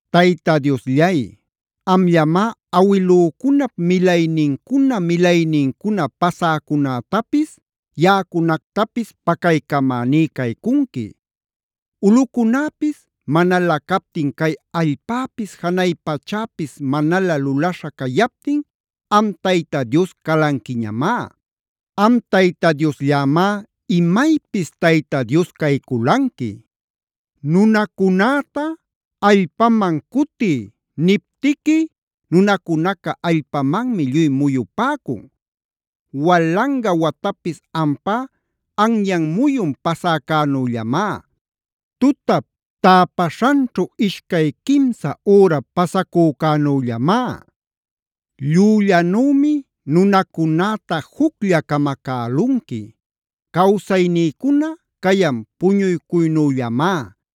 Tayta Diosllay, amllamá awilücunap milaynincuna-milaynincuna pasäcunätapis, yaꞌacunactapis pacaycamäní caycunqui. Ulꞌucunäpis manalä captin, cay allpäpis, janay pachäpis manalä lulaśha cayaptin, am Tayta Dios calanquiñamá. Am Tayta Diosllämá imaypis Tayta Dios cayculanqui. Nunacunäta: “Allpaman cutiy” niptiqui, nunacunaca allpamanmi lluy muyupäcun. Walanga watapis ampá anyan muyun pasäcänüllamá.a Tutap täpaśhanćhu ishcay-quimsa üra pasacücänüllamá. Llüllanümi nunacunäta juclla camacälunqui. Cawsaynïcuna cayan puñuycuynüllamá,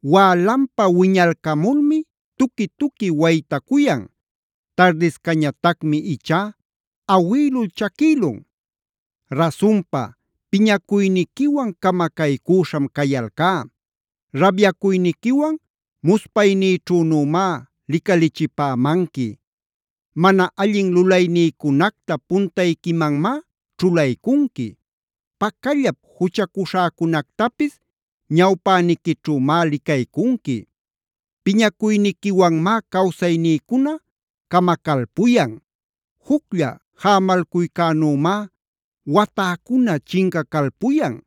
Wälanpa wiñalcamulmi tuqui-tuqui waytacuyan. Tardiscañatacmi ichá awïlul chaquïlun. Rasunpa, piñacuyniquiwan camacaycüśham cayalcá. Rabyacuyniquiwan muspaynïćhünümá licalichipämanqui. Mana allin lulaynïcunacta puntayquimanmá ćhulaycunqui. Pacallap juchacuśhäcunactapis ñawpäniquićhümá licaycunqui. Piñacuyniquiwanmá cawsaynïcuna camacalpuyan. Juclla jämalcuycänümá watäcuna chincacalpuyan.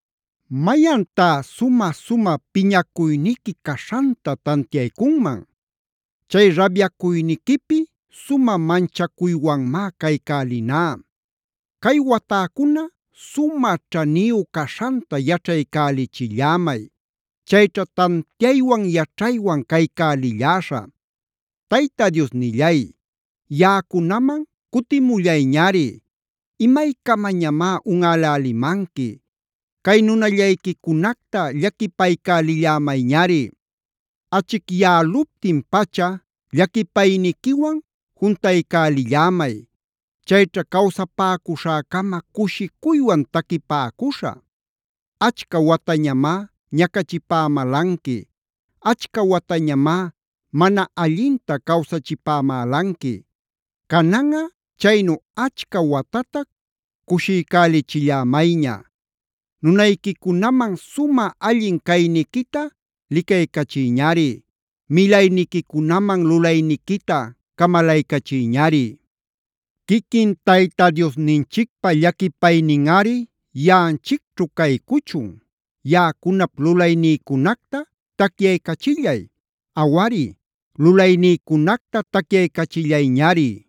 ¿Mayantá sumä-sumä piñacuyniqui caśhanta tantiaycunman? Chay rabyacuyniquipi sumä manchacuywanmá caycäliná. Cay watäcuna sumä ćhaniyu caśhanta yaćhaycälichillämay. Chayćha tantiaywan yaćhaywan caycälilläśhä. Tayta Diosnillay, yaꞌacunaman cutimullayñari. ¿Imaycamañamá unꞌälälimanqui? Cay nunallayquicunacta llaquipaycälillämayñari. Achicyäluptin-pacha llaquipayniquiwan juntaycälillämay. Chayćha cawsapäcuśhäcama cushicuywan taquipäcuśhä. Achca watañamá ñacachipämälanqui. Achca watañamá mana allinta cawsachipämälanqui. Cananꞌa chaynu achca watatac cushiycälichillämayña. Nunayquicunaman sumä allin cayniquita licaycachiyñari. Milaynincunaman lulayniquita camalaycachiyñari. Quiquin Tayta Diosninchicpa llaquipayninꞌari yaꞌanchicćhu caycuchun. Yaꞌacunap lulaynïcunacta tacyaycachillay. Awari, lulaynïcunacta tacyaycachillayñari.